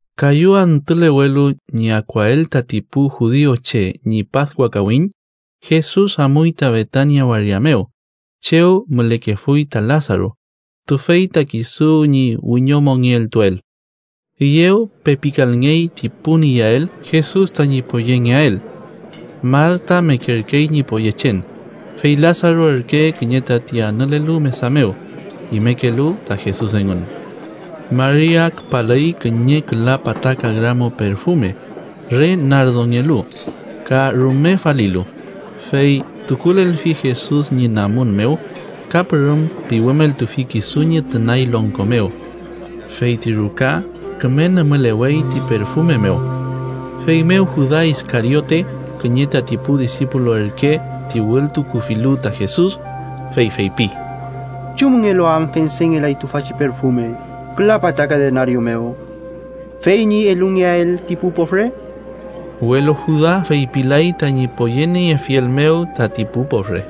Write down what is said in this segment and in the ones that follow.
Kayu antülewelu ñi akuael tati pu judiuche ñi Paskua kawiñ, Jesus amuy ta Betania waria mew, chew mülekefuy ta Lasaru, tüfey ta kisu ñi wiñomongeltuel. Üyew pepikalngey ti pun iyael Jesus tañi poyengeael. Marta mekerkey ñi poyechen, fey Lasaru ürke kiñe tati anülelu mesa mew, imekelu ta Jesus engün. Maria küpalüy kiñe küla pataka gramo perfume, re nardongelu, ka rume falilu, fey tukulelfi Jesus ñi namun mew ka pürüm piwümeltufi kisu ñi tünay longko mew. Fey ti ruka küme nümülewey ti perfume mew. Feymew Juda Iskariote, kiñe tati pu disipulu ürke ti wültukufilu ta Jesus, fey feypi: —¿Chumngelu am fendengelay tüfachi perfume küla pataka denario mew, fey ñi elungeael ti pu pofre? Welu Juda feypilay tañi poyeniefiel mew tati pu pofre,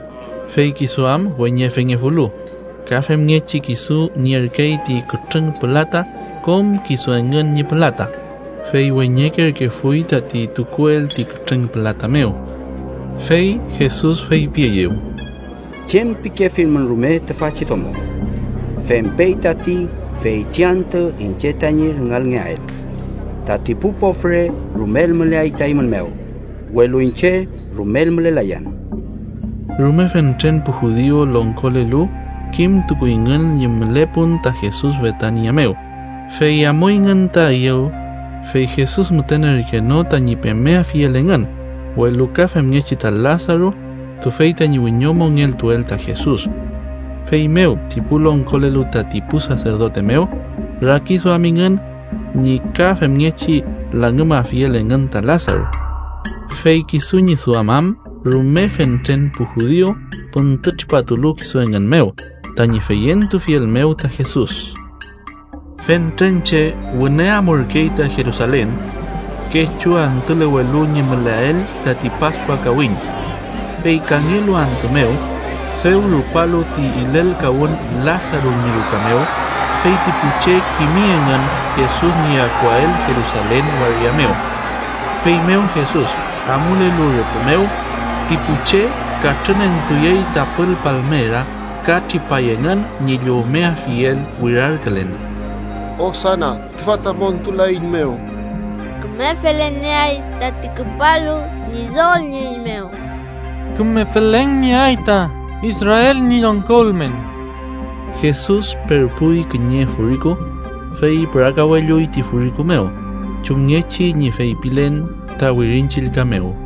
fey kisu am weñefengefulu, ka femngechi kisu nierkey ti kütrüng pülata kom kisu engün ñi pülata, fey weñekerkefuy tati tukuel ti kütrüng pülata mew. Fey Jesus feypieyew: —Chem pikefilmün rume, tüfachi domo fempey tati feychi antü iñche tañi rüngalngeael. Tati pu pofre rumel müleay ta eymün mew, welu iñche rumel mülelayan. Rume fentren pu judiu longkolelu kimtukuyngün ñi mülepun ta Jesus Betania mew, fey amuyngün ta üyew, fey Jesus müten ürke no tañi pemeafiel engün, welu ka femngechi ta Lasaru, tüfey tañi wiñomongeltuel ta Jesus. Feymew ti pu longkolelu tati pu saserdote mew rakiduamingün ñi ka femngechi langümafiel engün ta Lasaru. Fey kisu ñi duam am rume fentren pu judiu püntütripatulu kisu engün mew tañi feyentufiel mew ta Jesus. Fentren che wüne amurkey ta Jerusalen kechu antülewelu ñi müleael tati Paskua kawiñ. Fey kangelu antü mew, dew rupalu ti ilelkawün Lasaru ñi ruka mew, fey ti pu che kimi engün Jesus ñi akuael Jerusalen waria mew. Feymew Jesus amulelu rüpü mew, ti pu che katrünentuyey tapül palmera ka tripay engün ñi llowmeafiel wirarkülen: “¡Osana, tüfa ta montulaeiñmew! ¡Küme felen nieay tati küpalu Ñidol ñi üy mew! ¡Küme felen nieay ta Israel ñi longko ülmen!” Jesus perpuy kiñe furiku, fey pürakawelluy ti furiku mew, chumngechi ñi feypilen ta Wirin Chillka mew: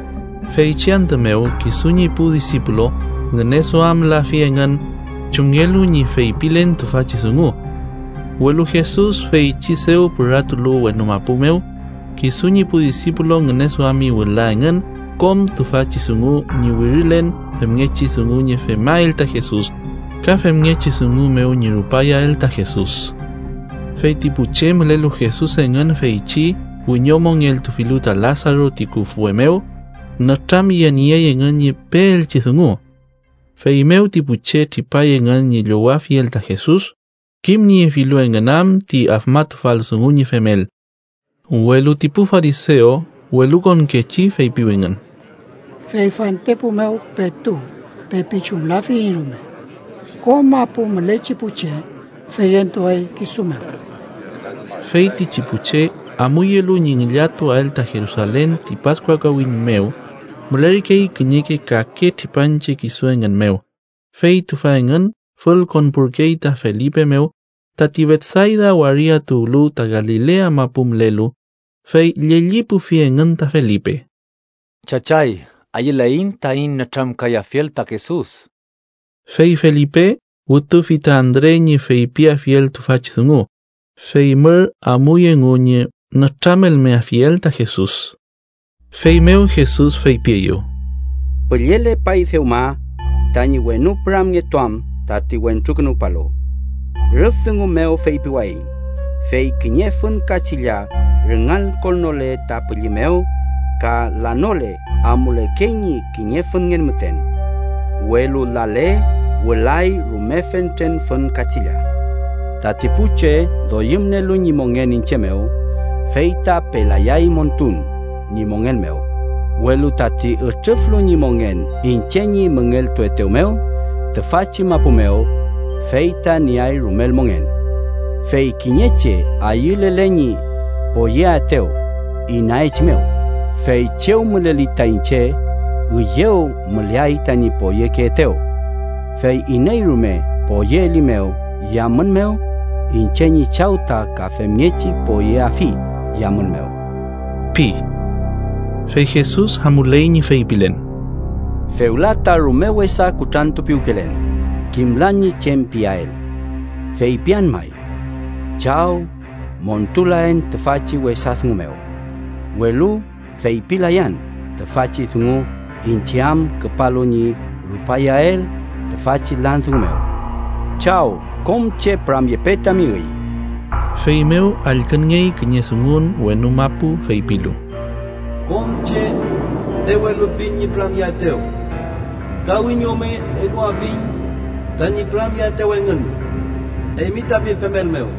Feychi antü mew kisu ñi pu disipulu ngüneduamlafi engün chumngelu ñi feypilen tüfachi dungu. Welu Jesus feychi dew püratulu wenu mapu mew, kisu ñi pu disipulu ngüneduami wüla engün kom tüfachi dungu ñi wirilen femngechi dungu ñi femael ta Jesus, ka femngechi dungu mew ñi rupayael ta Jesus. Fey ti pu che mülelu Jesus engün feychi wiñomongeltufilu ta Lasaru ti küfwe mew, nütramyeniey engün ñi peelchi dungu. Feymew ti pu che tripay engün ñi llowafiel ta Jesus, kimniefilu engün am ti afmatufal dungu ñi femel. Welu ti pu farisew welukonkechi feypiwingün: —Fey fantepu mew petu pepi chumlafiyiñ rume. ¡Kom mapu mülechi pu che feyentuay kisu mew! Feytichi pu che amuyelu ñi ngillatuael ta Jerusalen ti Paskua kawiñ mew, mülerkey kiñeke kake tripanche kisu engün mew, fey tüfa engün fülkonpurkey ta Felipe mew, tati Betsayda waria tuwlu ta Galilea mapu mülelu, fey llellipufi engün ta Felipe: —Chachay, ayüleiñ taiñ nütramkayafiel ta Jesus. Fey Felipe wütufi ta Andre ñi feypiafiel tüfachi dungu, fey mür amuy engu ñi nütramelmeafiel ta Jesus. Feymew Jesus feypieyew: —Püllelepay dewma tañi wenu püramngetuam tati Wentrukünuwpalu. Rüf dungu mew feypiwayiñ, fey kiñe fün kachilla rüngalkonnole ta pülli mew ka lanole, amulekey ñi kiñe fünngen müten. Welu lale, wülay rume fentren fün kachilla. Tati pu che doyümnielu ñi mongen iñche mew, fey ta pelayay montun ñi mongen mew, welu tati ütrüflu ñi mongen iñche ñi müngeltuetew mew tüfachi mapu mew, fey ta nieay rumel mongen. Fey kiñe che ayülele ñi poyeaetew, inaechimew, fey chew müleli ta iñche, üyew müleay tañi poyekeetew. Fey iney rume poyeelimew yamün mew, iñche ñi Chaw ta ka femngechi poyeafi yamün mew ―pi. Fey Jesus amuley ñi feypilen: ¡Fewla ta rume wesa kutrantupiwkelen! Kimlan ñi chem piael. ¿Feypian may: “Chaw, montulaen tüfachi wesa dungu mew”? ¡Welu feypilayan tüfachi dungu iñche am küpalu ñi rupayael tüfachi lan dungu mew! Chaw, kom che püramyepe tami üy. Feymew allkünngey kiñe dungun wenu mapu feypilu: “Kom che dew elufiñ ñi püramyeaetew ka wiñome eluafiñ tañi püramyeaetew engün eymi tami femel mew.”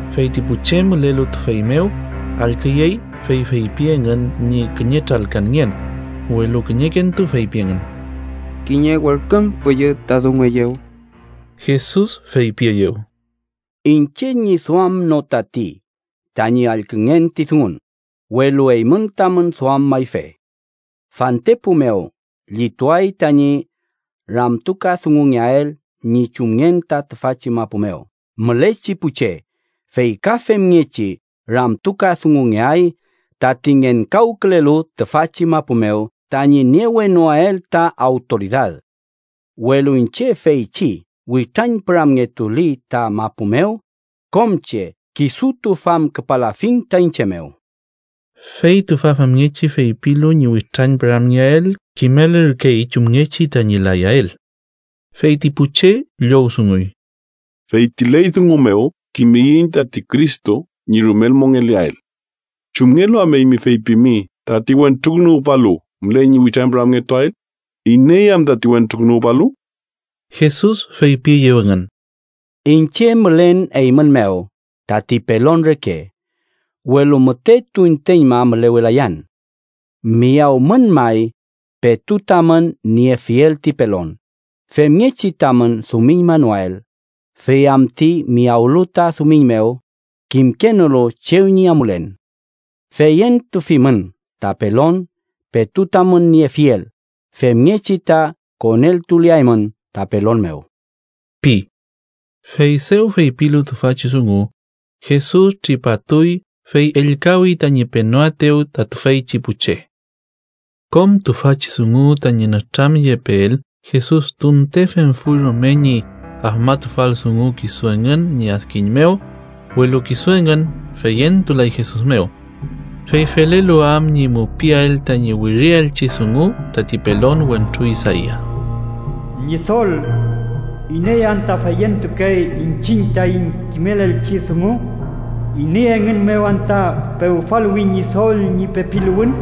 Fey ti pu che mülelu tüfey mew allküyey, fey feypi engün ñi kiñe tralkanngen, welu kiñekentu feypi engün: —Kiñe werken püllü ta dungueyew. Jesus feypieyew: —Iñche ñi duam no tati tañi allküngen ti dungun, welu eymün tamün duam mayfe. Fantepu mew llituay tañi ramtukadungungeael ñi chumngen ta tüfachi mapu mew mülechi pu che, fey ka femngechi ramtukadungungeay tati ngenkawkülelu tüfachi mapu mew tañi niewenoael ta awtoridad. Welu iñche feychi witrañpüramngetuli ta mapu mew, kom che kisutu famküpalafiñ ta iñche mew. Fey tüfa famngechi feypilu ñi witrañpüramngeael kimelürkey chumngechi tañi layael. Fey ti pu che llowdunguy: —Fey ti ley dungu mew kimiyiñ tati Cristo ñi rumel mongeleael. ¿Chumngelu am eymi feypimi tati Wentrukünuwpalu müley ñi witrañpüramngetuael? ¿Iney am tati Wentrukünuwpalu? Jesus feypieyew engün: —Iñche mülen eymün mew tati pelon reke, welu müte tunteñma mülewelayan. Miyawmün may, petu tamün niefiel ti pelon, femngechi tamün dumiñmanoael, fey am ti miyawlu ta dumiñ mew, kimkenolu chew ñi amulen. Feyentufimün ta pelon petu tamün niefiel femngechi ta koneltuleaymün ta pelon mew ―pi. Fey dew feypilu tüfachi dungu, Jesus tripatuy fey ellkawi tañi penoaetew ta tüfeychi pu che. Kom tüfachi dungu tañi nütramyepeel Jesus tunte femfuy rume ti afmatufal dungu kisu engün ñi adkiñ mew, welu kisu engün feyentulay Jesus mew. Fey felelu am ñi mupiael tañi wirielchi dungu tati pelon wentru Isaia: “Ñidol, ¿Iney anta feyentukey iñchiñ taiñ kimelelchi dungu? ¿Iney engün mew anta pewfaluwi Ñidol ñi pepiluwün?”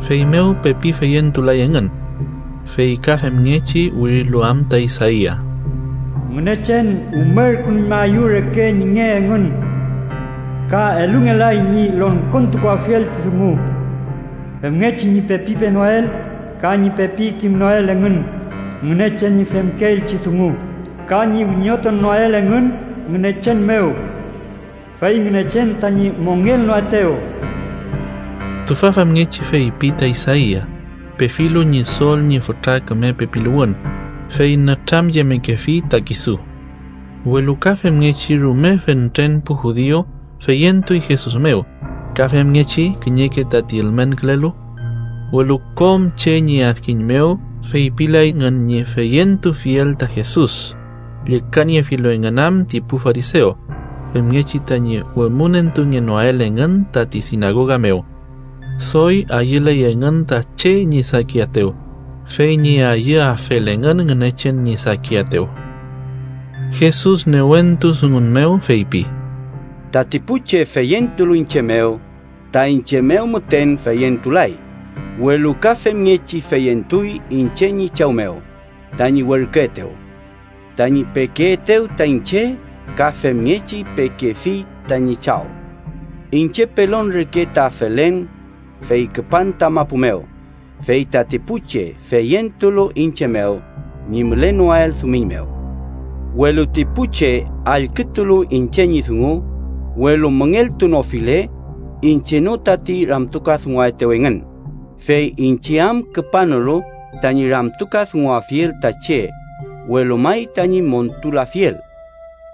Feymew pepi feyentulay engün, fey ka femngechi wirilu am ta Isaia: “Ngünechen umerkünuñmaeyew reke ñi nge engün ka elungelay ñi longkontukuafiel ti dungu, femngechi ñi pepi penoael ka ñi pepi kimnoael engün Ngünechen ñi femkeelchi dungu, ka ñi wiñotunoael engün Ngünechen mew, fey Ngünechen tañi mongelnoaetew.” Tüfa famngechi feypi ta Isaia, pefilu Ñidol ñi fütra küme pepiluwün, fey nütramyemekefi ta kisu. Welu ka femngechi, rume fentren pu judiu feyentuy Jesus mew, ka femngechi kiñeke tati ülmenkülelu. Welu kom che ñi adkiñ mew feypilay engün ñi feyentufiel ta Jesus, llükaniefilu engün am ti pu farisew, femngechi tañi wemünentungenoael engün tati sinagoga mew. Doy ayüley engün ta che ñi sakiaetew, fey ñi ayüafel engün Ngünechen ñi sakiaetew. Jesus newentu dungun mew feypi: “Tati pu che feyentulu iñche mew, ta iñche mew müten feyentulay, welu ka femngechi feyentuy iñche ñi Chaw mew, tañi werküetew. Tañi pekeetew ta iñche ka femngechi pekefi tañi Chaw. Iñche pelon reke ta felen, fey küpan ta mapu mew, fey tati pu che feyentulu iñche mew ñi mülenoael dumiñ mew. “Welu ti pu che allkütulu iñche ñi dungu, welu müngeltunofile, iñche no tati ramtukadunguaetew engün, fey iñche am küpanolu tañi ramtukadunguafiel ta che, welu may tañi montulafiel.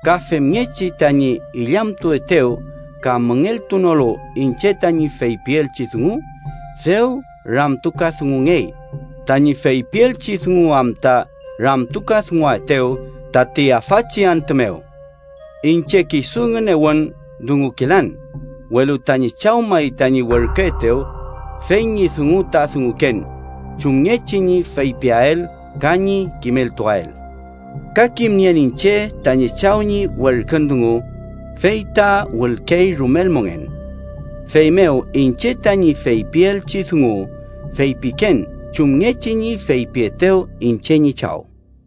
Ka femngechi tañi illamtuetew ka müngeltunolu iñche tañi feypielchi dungu, dew ramtukadungungey, tañi feypielchi dungu am ta ramtukadunguaetew tati afachi antü mew. Iñche kisu ngünewün dungukelan, welu tañi Chaw may tañi werküetew, fey ñi dungu ta dunguken, chumngechi ñi feypiael ka ñi kimeltuael. Ka kimnien iñche tañi Chaw ñi werkün dungu fey ta wülkey rumel mongen. Feymew, iñche tañi feypielchi dungu feypiken chumngechi ñi feypietew iñche ñi Chaw.”